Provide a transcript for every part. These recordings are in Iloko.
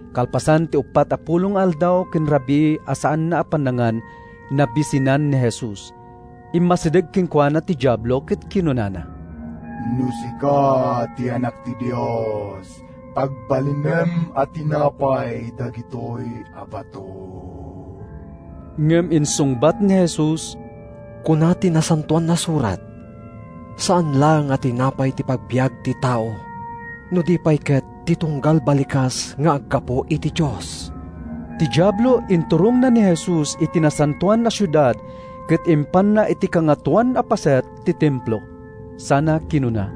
Kalpasan ti uppat a pulo nga aldaw ken rabii a saanna a pannangan, nabisinan ni Jesus. Immasideg kenkuana ti Diablo ket kinunana, “No sika ti Anak ti Dios, pagbalinem a tinapay dagitoy a bato.” Ngem insungbat ni Jesus, “Kuna ti Nasantoan a Surat, ‘Saan laeng a tinapay ti pagbiag ti tao no di pay ket ti tunggal balikas nga aggapu iti Dios.’” Ti Diablo inturongna ni Jesus iti Nasantoan a Siudad ket impanna iti kangatoan a paset ti Templo, sana kinuna,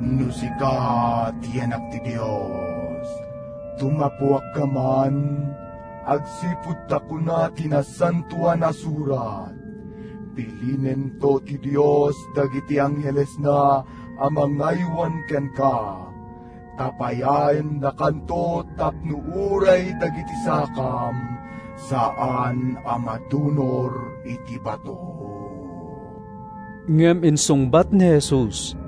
“No sika ti Anak ti Dios, tumappuakka man, agsipud ta kuna ti Nasantoan a Surat, ‘Bilinento ti Dios dagiti anghelesna a mangaywan kenka: Tapayaendakanto Tapno uray dagiti sakam saan a madunor iti bato.’” Ngem insungbat ni Jesus,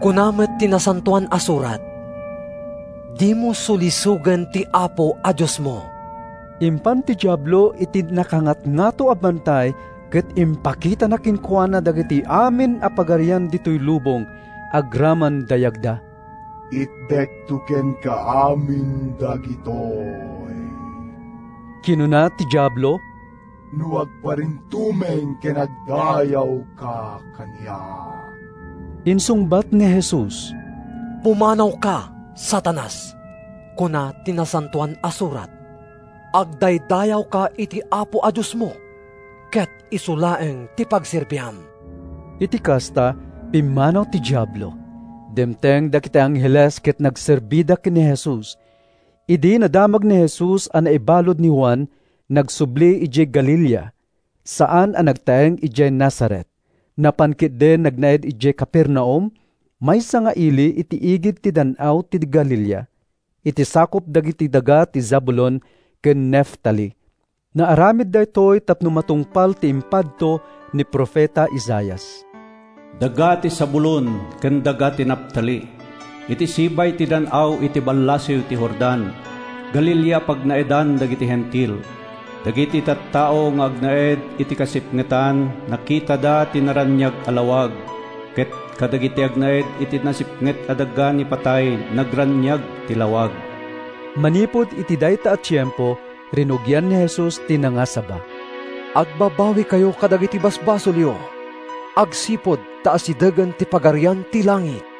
“Kuna met ti Nasantoan a Surat, ‘Dimo sulisogen ti Apo a Diosmo.’” Impan ti Diablo iti nakangatngato a bantay ket impakitana kenkuana dagiti amin a pagarian ditoy lubong, agraman dayagda. “Itedko kenka amin dagitoy,” kinuna ti Diablo, “no agparintumeng ken agdaydayawka kaniak.” Insungbat ni Jesus, “Pumanawka, Satanas! Kuna ti Nasantoan a Surat, ‘Agdaydayawka iti Apo a Diosmo ket isu laeng ti pagserbiam.’” Iti kasta, pimmanaw ti Diablo. Dimteng dagiti angheles ket nagserbida ken ni Jesus. Idi nadamag ni Jesus a naibalud ni Juan, nagsubli idiay Galilea. Saan a nagtaeng idiay Nazaret. Napan ketdi nagnaed idiay Capernaum, maysa nga ili iti igid ti Dan-aw ti Galilea, iti sakup dagiti daga ti Zabulon ken Neftali. Naaramid daytoy tapno matungpal ti impadto ni profeta Isaias: “Daga ti Zabulon, ken daga ti Neftali, Iti sibay ti dan-aw, iti ballasiw ti Jordan, Galilea a pagnaedan dagiti Hentil! Dagiti tattao nga agnaed iti kasipngetan Nakitada ti naraniag a lawag! Ket kadagiti agnaed iti nasipnget a daga ni patay Nagraniag ti lawag!” Manipud iti dayta a tiempo, rinugian ni Jesus ti nangasaba: “Agbabawikayo kadagiti basbasolyo, agsipud ta asidegen ti Pagarian ti langit.”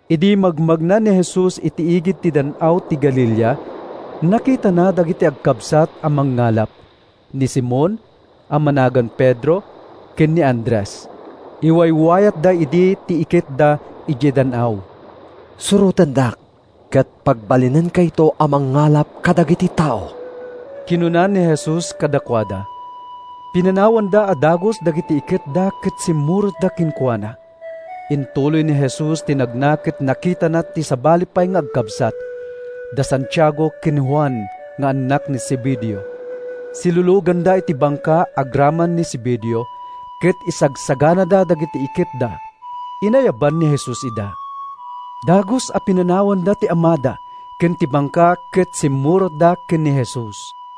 Idi magmagna ni Jesus iti igid ti Dan-aw ti Galilea, nakitana dagiti agkabsat a mangngalap, ni Simon (a managan Pedro) ken ni Andres. Iwaywayatda idi ti iketda idiay dan-aw. “Surotendak ket pagbalinenkayto a mangngalap kadagiti tao,” kinuna ni Jesus kadakuada. Pinanawanda a dagus dagiti iketda ket simmurotda kenkuana. Intuloy ni Jesus ti nagna ket nakitana ti sabali pay nga agkabsat, da Santiago ken Juan nga annak ni Zebedeo. Siluluganda iti bangka agraman ni Zebedeo ket isagsaganada dagiti iketda. Inayaban ni Jesus ida. Dagus a pinanawanda ti amada ken ti bangka ket simmurotda ken ni Jesus.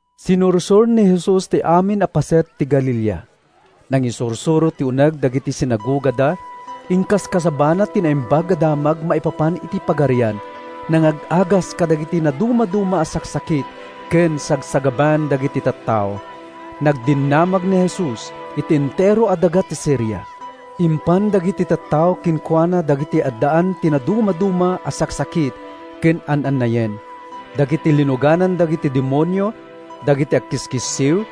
Sinursor ni Jesus ti amin a paset ti Galilea. Nangisursuro iti uneg dagiti sinagogada. Inkaskasabana ti Naimbag a Damag maipapan iti Pagarian. Nangag-agas kadagiti nadumaduma a saksakit ken sagsagabaen dagiti tattao. Nagdinamag ni Jesus iti entero a daga ti Siria. Impan dagiti tattao kenkuana dagiti addaan iti nadumaduma a saksakit ken an-annayen: dagiti linuganan dagiti demonio, dagiti agkiskissiw,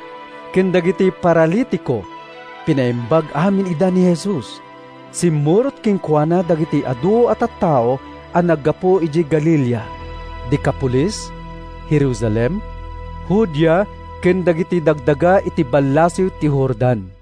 ken dagiti paralitiko. Pinaimbag amin ida ni Jesus. Simmurot kenkuana dagiti adu a tattao a naggapu idiay Galilea, Decapolis, Jerusalem, Judea ken dagiti dagdaga iti ballasiw ti Jordan.